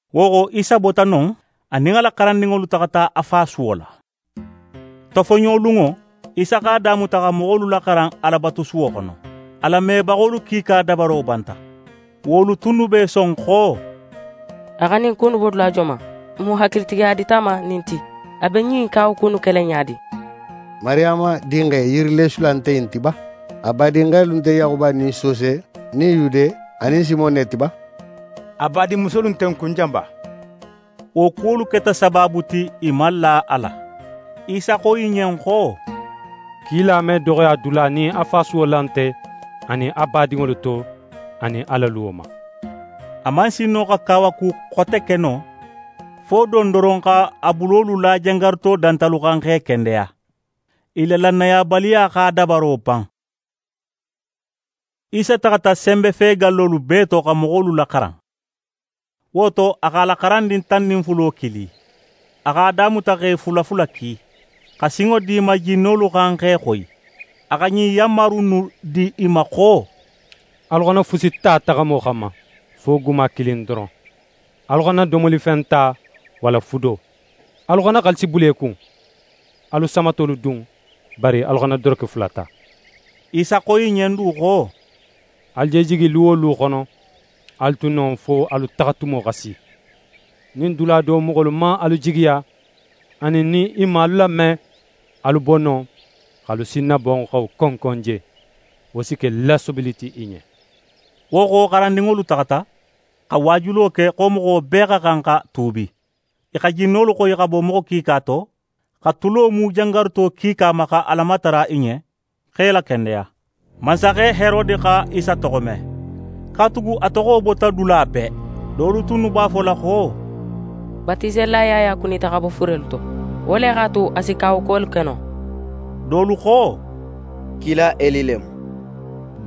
Wo xo, Isa bota non, a nin a la xarandinŋolu taxata a fasuwo la. Tofoɲolunŋo, Isa x'a damuta xa moxolu laxaran Alabatusuwo xono. A lamebaxolu kiika dabaro banta. Wolu tunnu be i son xo: «A xa ɲin ku innu bo dula joman? Mun hakilitigiya dita a ma ɲin ti? A be ɲin kawaku innu kela ɲa di? Mariyama dinxe yirileesula nte ɲin ti ba? A badinxelu nte Yaxuba nin Sose nin Yude anin Simon ne ti ba? A badinmusolu nte n kun jan ba?» Wo kuwolu keta sabaabu ti i man la a la. Isa xo i ɲen xo: «Kila me doxoya dula, nin a fasuwo la nte, anin a badinŋolu to, anin a la luwo ma.» A man sin no xa kawaku xote ke non fo don doron, x'a bulolu la jangaruto dantalu xan, x'e kendeya. I la lannayabaliya x'a dabaro ban. Isa taxata senbefegallolu bee to, xa moxolu laxaran. Wo to, a x'a la xarandin tan nin fulo kili. A x'a damuta x'e fula fula ki, xa sinŋo di i ma jinnolu xan x'e xoyi. A xa ɲin yanmaru innu di i ma xo: «Alu xana fusi ta taxamo xanma, fo guma kilin doron. Alu xana domolifen ta, walla fudo. Alu xana xaalisi bula i kun. Alu samatolu dun, bari alu xana doroke fula ta.» Isa xo i ɲen du xo: «Alu je jigi lu wo lu xono, alu tu non fo alu taxatumo xa si. Nin dula do moxolu man alu jigiya, anin nin i man alu lame, alu bo non, x'alu sinnabanxo konkon je. Wo si ke lasobili ti i ɲen.» Wo xo, xarandinŋolu taxata, xa waajulo ke xo moxo bee xa xan xa tuubi. I xa jinnolu xoyi xa bo moxo kiika to, xa tulo mu jangaruto kiika ma, xa Ala matara i ɲen, x'e lakendeya. Mansaxe Herode xa Isa toxo me, katugu a toxo bota dula bee. Dolu tunnu b'a fola xo: «Batiselila Yaya kunita xa bo furelu to. Wo le x'a tu, a si kawakuwolu ke no.» Dolu xo: «Kila Eli le mu.»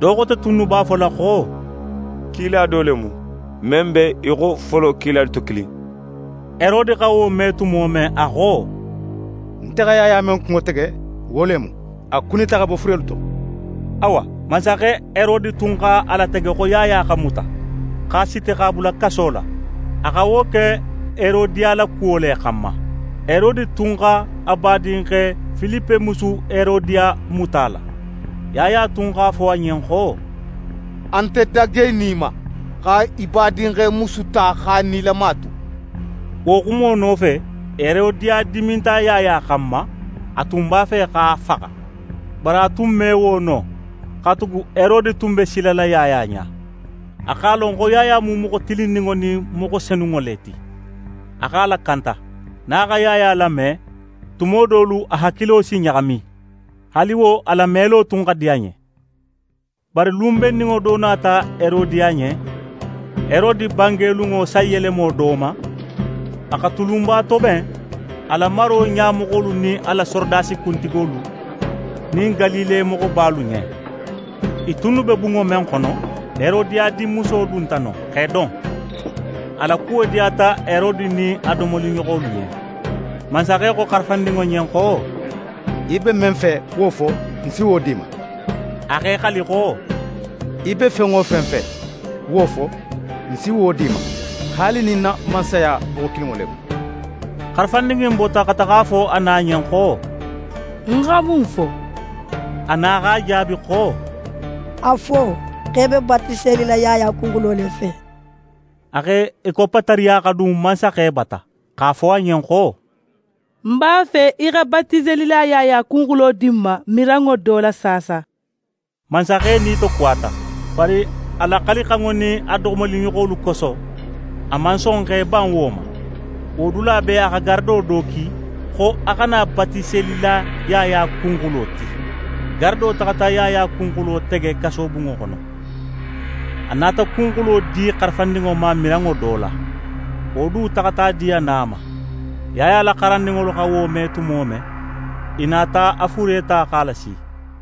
Do xote tunnu b'a fola xo: «Kila do le mu, men be í xo folo kilalu to kilin.» Herode xa wo me tumo men, a xo: «Nte xa Yaya men kunŋo tege, wo le mu. A kunita xa bo furelu to.» Awa, mansaxe Herode tun x'a latege xo Yaya xa muta, x'a siti, x'a bula kaso la. A xa wo ke Herodiya la kuwo le xanma. Herode tun x'a badinxe Filipe musu Herodiya muta a la. Yaya tun x'a fo a ɲen xo: «A nte dagenin í ma, xa í badinxe musu ta x'a nilama tu.» Wo xumo nofe, Herodiya diminta Yaya xanma; a tun b'a fe x'a faxa. Bari a tun me wo no, katugu Herode tun be silala Yaya ɲa. A x'a lon xo Yaya mu moxo tilinninŋo nin moxo senunŋo le ti. A x'a lakanta. Nin a xa Yaya lame, tuma dolu, a hakilo si ɲaxami; haali wo, a lamelo tun xa di a ɲen. Bari, lun benninŋo do nata Herodiya ɲen. Herode bangelunŋo sanyelemo do ma, a xa tulunba toben a la maro ɲamoxolu nin a la sorodasi kuntigolu nin Galile moxobalu ɲen. I tunnu be bunŋo men xono, Herodiya dinmuso dunta non, x'é don. A la kuwo diyata Herode nin a domoliɲoxolu ɲen. Mansaxe xo xarafandinŋo ɲen xo: «Í be men fe, wo fo, ń si wo di í ma.» A x'é xali xo: «Í be fen wo fen fe, wo fo, ń si wo di í ma; haali nin ń na mansaya boxo kilinŋo le mu.» Xarafandin in bota, xa taxa a fo a na ɲen xo: «Ń xa mun fo?» A na x'a jaabi xo: «A fo xo í be Batiselila Yaya kunxulo le fe.» A x'é koppa tariya xa dun mansaxe bata, x'a fo a ɲen xo: «Ń b'a fe í xa Batiselila Yaya kunxulo di ń ma miranŋo do la saasa.» Mansaxe nitokuwata, bari a la xalixanŋo nin a domoliɲoxolu koso, a man son x'é ban wo ma. Wo dula bee, a xa garado do ki, xo a xa na Batiselila Yaya kunxulo ti. Garado taxata Yaya kunxulo tege kasobunŋo xono. A nata kunxulo di xarafandinŋo ma miranŋo do la. Wo du taxata a di a na ma. Yaya la xarandinŋolu xa wo me tumo men, i nata a fure ta, x'a lasi.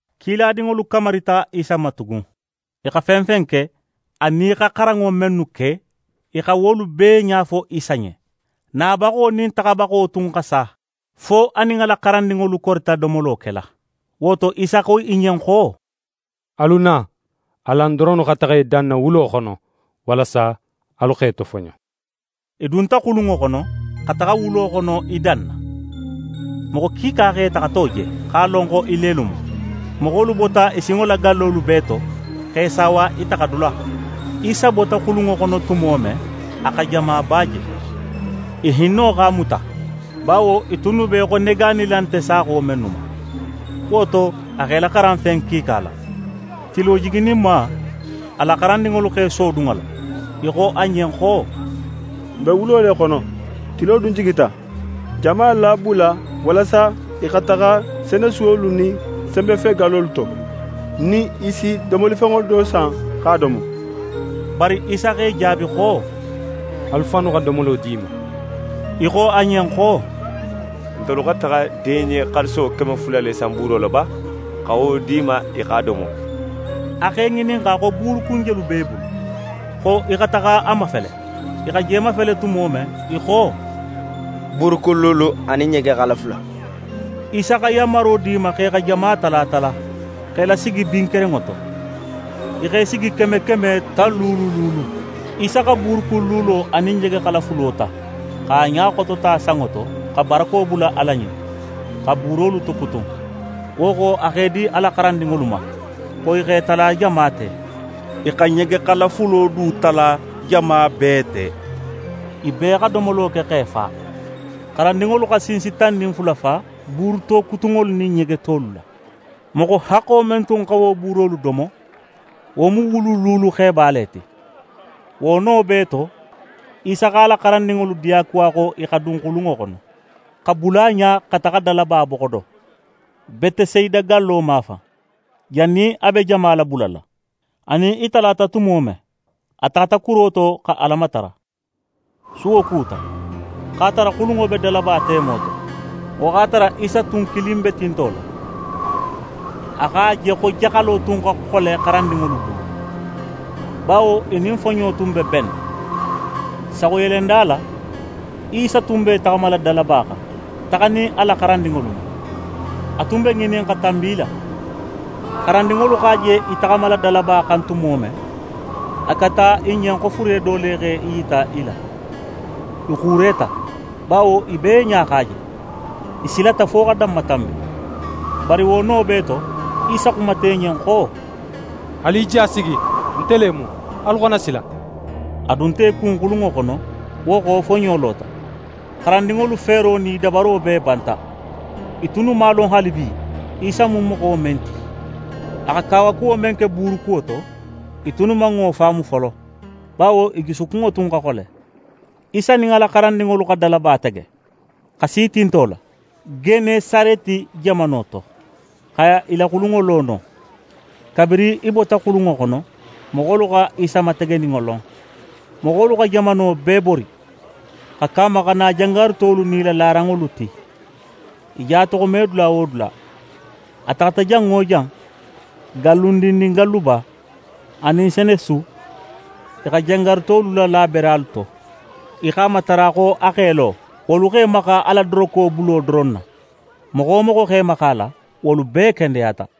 Kiladinŋolu kamarita Isa ma tugun. I xa fen fen ke, anin i xa xaranŋo mennu ke, i xa wolu bee ɲa fo Isa ɲen. Nabaxo nin taxabaxo tun xa sa, fo a nin a la xarandinŋolu korita domolo kela. Wo to, Isa xo i ɲen xo: «Alu na, alan doronnu xa taxa i danna wulo xono, walasa alu x'e tofoɲo.» I dunta xulunŋo xono, xa taxa wulo xono, i danna. Moxo kiika x'e taxato je, x'a lon xo i lelu mu. Moxolu bota i sinŋo la gallolu bee to, x'e saawa i taxadula. Isa bota xulunŋo xono tumo men, a xa jamaba je. I hinno x'a muta, bawo i tunnu be í xo negaanila nte saaxo mennu ma. Wo to, a x'e laxaran fen kiika la. Tilo jigininma, a la xarandinŋolu x'e sodun a la, i xo a ɲen xo: «N be wulo le xono, tilo dun jigita. Jama labula walasa i xa taxa senesuwolu nin senbetogallolu to, nin i si domolifenŋo do san, x'a domo.» Bari Isa x'e jaabi xo: «Alu fannu xa domolo di i ma!» I xo a ɲen xo: «Ntelu xa taxa deɲe xaaliso keme fula le san buuro la ba, xa wo di i ma i x'a domo?» A x'e ŋininxa xo buurukun jelu b'e bulu, xo i xa taxa a mafele. I xa je mafele tumo men, i xo: «Buurukun luulu anin ɲegexala fula.» Isa xa yanmaro di i ma xo i xa jama tala tala, x'e lasigi bin kerenŋo to. I x'e sigi keme keme, tan luulu luulu. Isa xa buurukun luulo anin ɲegexala fulo ta, x'a ɲa xotota sanŋo to, xa barako bula Ala ɲen, xa buurolu tokutun. Wo xo, a x'e di xarandinŋolu ma xo i x'e tala jama te. I xa ɲegexala fulo du tala jama bee te. I bee xa domolo ke x'e fa. Xarandinŋolu xa sinsi tan nin fula fa buuru tokutunŋolu nin ɲegetolu la. Moxo haxxo men tun xa wo buurolu domo, wo mu wulu luulu xeba le ti. Wo no bee to, Isa x'a la xarandinŋolu diyakuwa xo i xa dun xulunŋo xono, xa bula a ɲa, xa taxa dalaba boxo do, Betesayida gallo mafan, jannin a be jama labulala. A nin i talata tumo men, a taxata kuro to, xa Ala matara. Suwo kuta, x'a tara xulunŋo be dalaba temo to. Wo x'a tara Isa tun kilin be tinto la. A x'a je xo jaxalo tun xa xole xarandinŋolu bulu, bawo i nin foɲo tun be benna. Saxuyelenda la, Isa tun be í taxamala dalaba xan, taxanin a la xarandinŋolu ma. A tun be ŋinin xa tanbi i la. Xarandinŋolu x'a je í taxamala dalaba xan tumo men, a keta i ɲen xo fure do le x'é yita i la. I xuureta, bawo i bee ɲa x'a je; i silata fo xa danmatanbi. Bari wo no bee to, Isa xumata i ɲen xo: «Alu i ja sigi, nte le mu. Alu xana sila!» A dunta i kun xulunŋo xono; wo xo, foɲo lota. Xarandinŋolu feero nin i dabaro bee banta. I tunnu man a lon haalibi, Isa mu moxo men ti. A xa kawakuwo men ke buuru kuwo to, i tunnu man wo faamu folo; bawo i jusukunŋo tun xa xole. Isa nin a la xarandinŋolu xa dalaba tege, xa si tinto la, Genesareti jamano to, xa i la xulunŋo lo non. Kabirin i bota xulunŋo xono, moxolu xa Isa mategeninŋo lon. Moxolu xa jamano bee bori, xa ke a ma xa na jangarutolu nin i la laranŋolu ti, i je a toxome dula wo dula. A taxata jan wo jan, gallundin nin galluba anin senesu, i xa jangarutolu lala beralu to. I x'a matara xo a x'é lo, wolu x'e maxa a la dorokebulo doron na. Moxo wo moxo x'é maxa a la, wolu bee kendeyata.